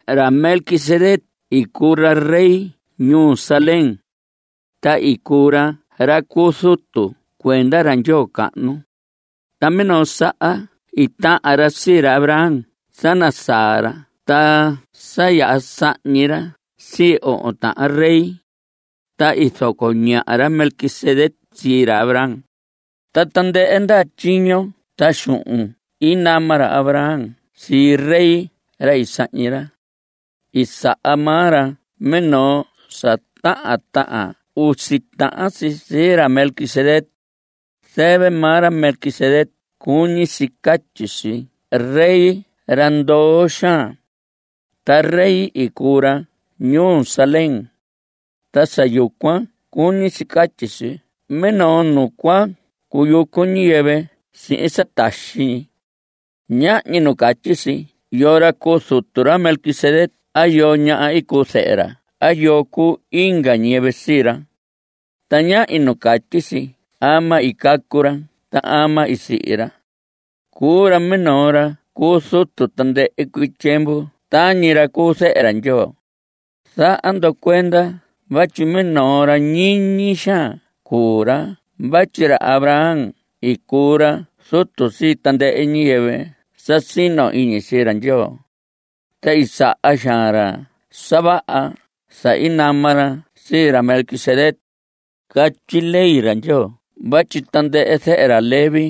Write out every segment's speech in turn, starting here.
Ra Melquisedec i cuu ra rey ñuu Salem, ta i cuu ra ra cu zutu cuenda ra Ndyoo cahnu. Ta minoo saha i tahan ra sii ra Abraham sa nasaa ra ta sa yaha sahñi ra sii ohon tahan rey. Ta i zoco ñaha ra Melquisedec sii ra Abraham. Ta tandɨhɨ ndaha tyiño ta xuhun i nama ra Abraham sii rey ra i sahñi ra, i saha maa ra minoo sa tahan tahan usi tahan si sii ra Melquisedec. Zɨvɨ maa ra Melquisedec cuñi si catyi si “rey ra ndoo xaan”. Ta rey i cuu ra ñuu Salem. Ta sa yucuan cuñi si catyi si minoo nu cua cuyucu ñiyɨvɨ sihin sa taxi ñi. Ñahñi nu catyi si yoo ra cuu zutu ra Melquisedec a yoo ña cuu zɨhɨ ra a yoo cuu inga ñiyɨvɨ sii ra. Ta ñahñi nu catyi si ama i cacu ra a ama i sihi ra. Cuu ra minoo ra cu zutu tandɨhɨ cuii tyiemvu tañi ra cu Zehe ra Ndyoo. Zaha ndo cuenda vatyi minoo ra ñiñi xaan cuu ra vatyi ra Abraham i cuu ra zutu sii tandɨhɨ ñiyɨvɨ sa sino iñi sii ra Ndyoo, ta i saha xaan ra sa vaha sa i nama ra sii ra Melquisedec. Catyi ley ra Ndyoo vatyi tandɨhɨ zehe ra Leví,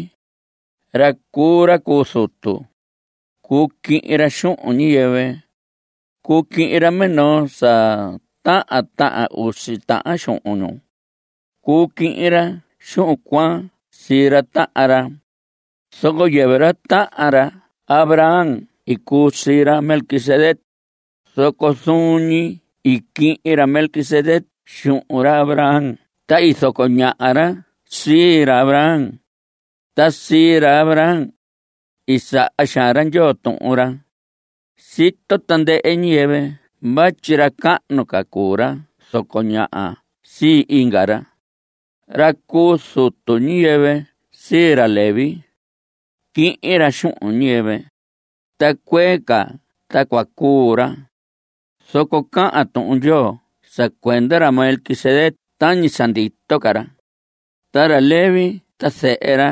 ra cuu ra cu zutu, cuu quihin ra xuhun ñiyɨvɨ. Cuu quihin ra minoo sa tahan tahan usi tahan xuhun ñu. Cuu quihin ra xuhun cuan sii ra tahan ra. Zoco yɨvɨ ra tahan ra Abraham i cuu sii ra Melquisedec, zoco zuun ñi i quihin ra Melquisedec xuhun ra Abraham ta i zoco ñaha ra sii ra Abraham. Ta sii ra Abraham, i saha xaan ra Ndyoo tuhun ra. Sito tandɨhɨ ñiyɨvɨ vatyi ra cahnu ca cuu ra zoco ñaha sii inga ra. Ra cu zutu, ñiyɨvɨ sii ra Leví, quihin ra xuhun ñiyɨvɨ, ta cuee ca ta cua cuu ra, zoco cahan Tuhun Ndyoo sa cuenda ra Melquisedec tañi sa ndito ca ra. Ta ra Leví ta zehe ra,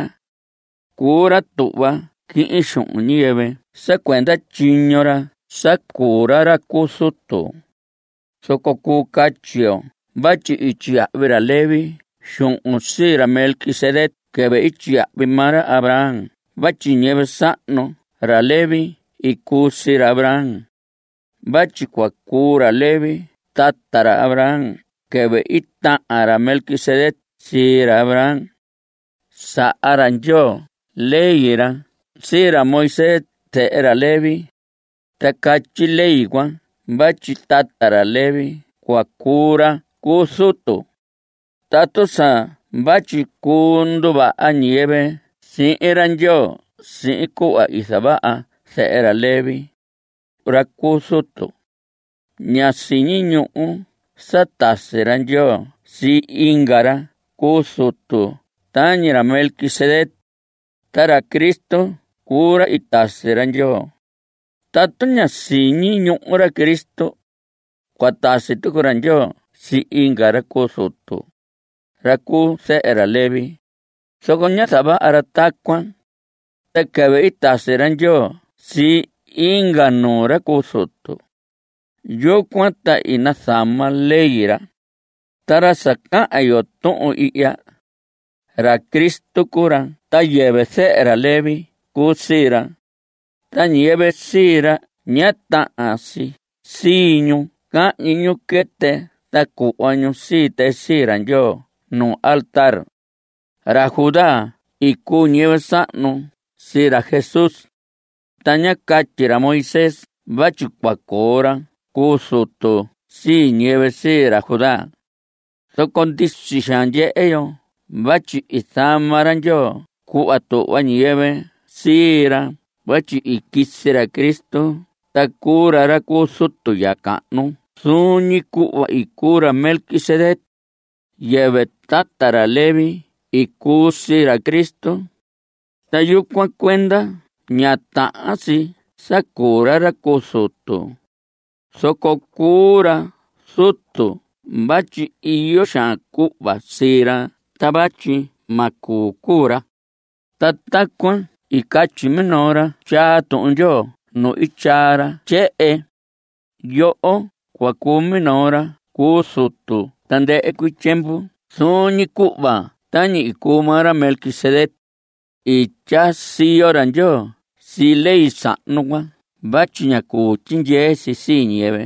cuu ra tuhva quihin xuhun ñiyɨvɨ sa cuenda tyiño ra sa cuu ra ra cu zutu, zoco cuu catyi yo vatyi i tyiyahvi ra Leví xuhun sii ra Melquisedec quɨvɨ i tyiyahvi maa ra Abraham vatyi ñiyɨvɨ sahnu ra Leví i cuu sii ra Abraham. Vatyi cua cuu ra Leví tata ra Abraham quɨvɨ i tahan ra Melquisedec sii ra Abraham. Saha ra Ndyoo ley ra sii ra Moisés zehe ra Leví. Ta catyi ley cuan vatyi tata ra Leví cua cuu ra cu zutu. Tatu sa vatyi cuu nduvaha ñiyɨvɨ sihin ra Ndyoo sihin cuhva i zavaha zehe ra Leví, ra cuu ra cu zutu, ña siñi ñuhu sa tasi ra Ndyoo sii inga ra cu zutu tañi ra Melquisedec (ta ra Cristo cuu ra i tasi ra Ndyoo). Tatu ñá siñi ñuhu ra Cristo, cua tasi tucu ra Ndyoo sii inga ra cu zutu, ra cu zehe ra Leví, zoco ñá zavaha ra tacuan. Ta quɨvɨ i tasi ra Ndyoo sii inga nuu ra cu zutu, yucuan ta i nazama ley ra. Ta ra sa cahan yo tuhun ihya (ra Cristo cuu ra) ta yɨvɨ zehe ra Leví cuu sii ra. Ta ñiyɨvɨ sii ra ña tahan si sii ñu cahñi ñu quɨtɨ ta cuhva ñu sii tɨ sii ra Ndyoo nu altar. Ra Judá i cuu ñiyɨvɨ sahnu sii ra Jesús, ta ñá catyi ra Moisés vatyi cua coo ra cu zutu sii ñiyɨvɨ sii ra Judá. Zoco ndisi xaan ndyehe yo vatyi i zama ra Ndyoo cuhva tuhva ñiyɨvɨ sii ra vatyi i quisi ra Cristo ta cuu ra ra cu zutu ya cahnu zuun ñi cuhva i cuu ra Melquisedec. Yɨvɨ tata ra Leví i cuu sii ra Cristo. Ta yucuan cuenda ña tahan si sa cuu ra ra cu zutu. Zoco cuu ra zutu vatyi iyo xaan cuhva sii ra ta vatyi ma cuu cuu ra. Ta tacuan i catyi minoo ra tyaa Tuhun Ndyoo nu i tyaa ra tyehen: Yoho cua cuu minoo ra cu zutu tandɨhɨ cuii tyiemvu Zuun ñi cuhva tañi i cuu maa ra Melquisedec. I tyaa siyo ra Ndyoo sii ley sahnu cuan vatyi ñá cuu tyindyee si sii ñiyɨvɨ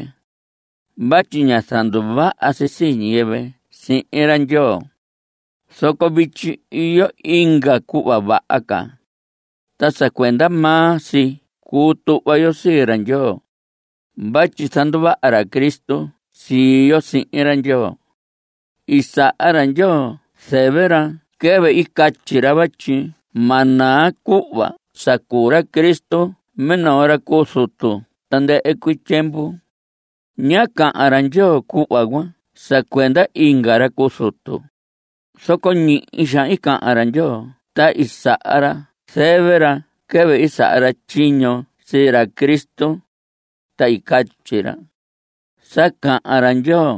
vatyi ñá zanduvaha si sii ñiyɨvɨ sihin ra Ndyoo. Zoco vityi iyo inga cuhva vaha ca, ta sa cuenda maa si cuu tuhva yo sii ra Ndyoo (vatyi zanduvaha ra Cristo sii yo sihin ra Ndyoo). I saha ra Ndyoo zɨvɨ ra quɨvɨ i catyi ra vatyi ma naa cuhva sa cuu ra Cristo minoo ra cu zutu tandɨhɨ cuii tyiemvu. Ñá cahan ra Ndyoo cuhva cuan sa cuenda inga ra cu zutu, zoco ñihi xaan i cahan ra Ndyoo ta i saha ra zɨvɨ ra quɨvɨ i saha ra tyiño sii ra Cristo, ta i catyi ra: Sa cahan ra Ndyoo,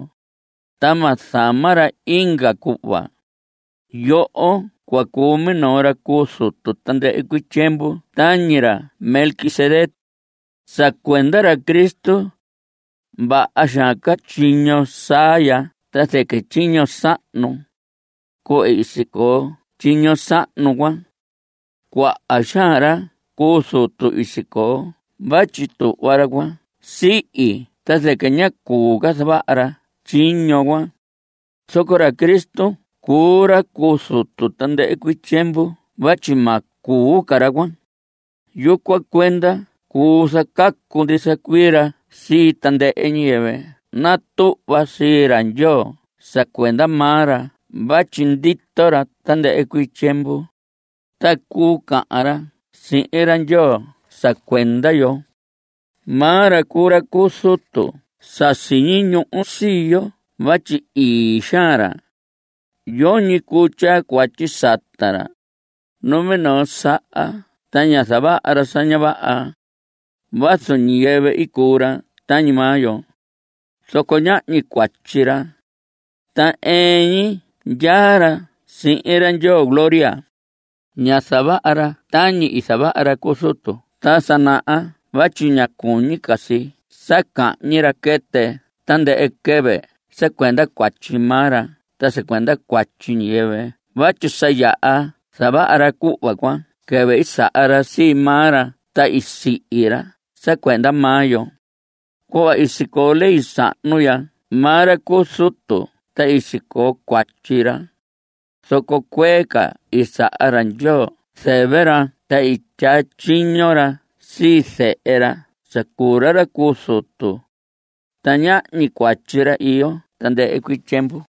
ta ma zama ra inga cuhva: “Yoho cua cuu minoo ra cu zutu tandɨhɨ cuii tyiemvu Tañi ra Melquisedec.” Sa cuenda ra Cristo, vaha xaan ca tyiño saa ya ta zɨquɨ tyiño sahnu. Cuhva i sicoo tyiño sahnu cuan, cuaha xaan ra cu zutu i sicoo vatyi tuhva ra cuan sihi ta zɨquɨ ñá cuu ca zavaha ra tyiño cuan. Zoco ra Cristo cuu ra cu zutu tandɨhɨ cuii tyiemvu vatyi ma cuu ca ra cuan. Yucuan cuenda cuu zacacu ndisa cuii ra sii tandɨhɨ ñiyɨvɨ natuhva sii ra Ndyoo sa cuenda maa ra vatyi ndito ra tandɨhɨ cuii tyiemvu, ta cuu cahan ra sihin ra Ndyoo sa cuenda yo. Maa ra cuu ra cu zutu sa siñi ñuhu sii yo vatyi ii xaan ra; yoñi cuu tyaa cuatyi sata ra. Numinoo saha ta ñá zavaha ra sa ña vaha. Vazu ñiyɨvɨ cuu ra tañi maa yo, zoco ñahñi cuatyi ra, ta ɨɨn ñi ndyaa ra sihin ra Ndyoo gloria. Ña zavaha ra tañi i zavaha ra cu zutu ta sa naha vatyi ña cuñi si sa cahñi ra quɨtɨ tandɨhɨ quɨvɨ sa cuenda cuatyi maa ra ta sa cuenda cuatyi ñiyɨvɨ vatyi sa yaha zavaha ra cuhva cuan quɨvɨ i saha ra sii maa ra ta i sihi ra sa cuenda maa yo. Cuhva i sicoo ley sahnu, ndya maa ra cu zutu ta i sicoo cuatyi ra, zoco cuee ca i saha ra Ndyoo zɨvɨ ra ta i tyaa tyiño ra sii zehe ra sa cuu ra ra cu zutu, ta ñahñi cuatyi ra iyo tandɨhɨ cuii tyiemvu.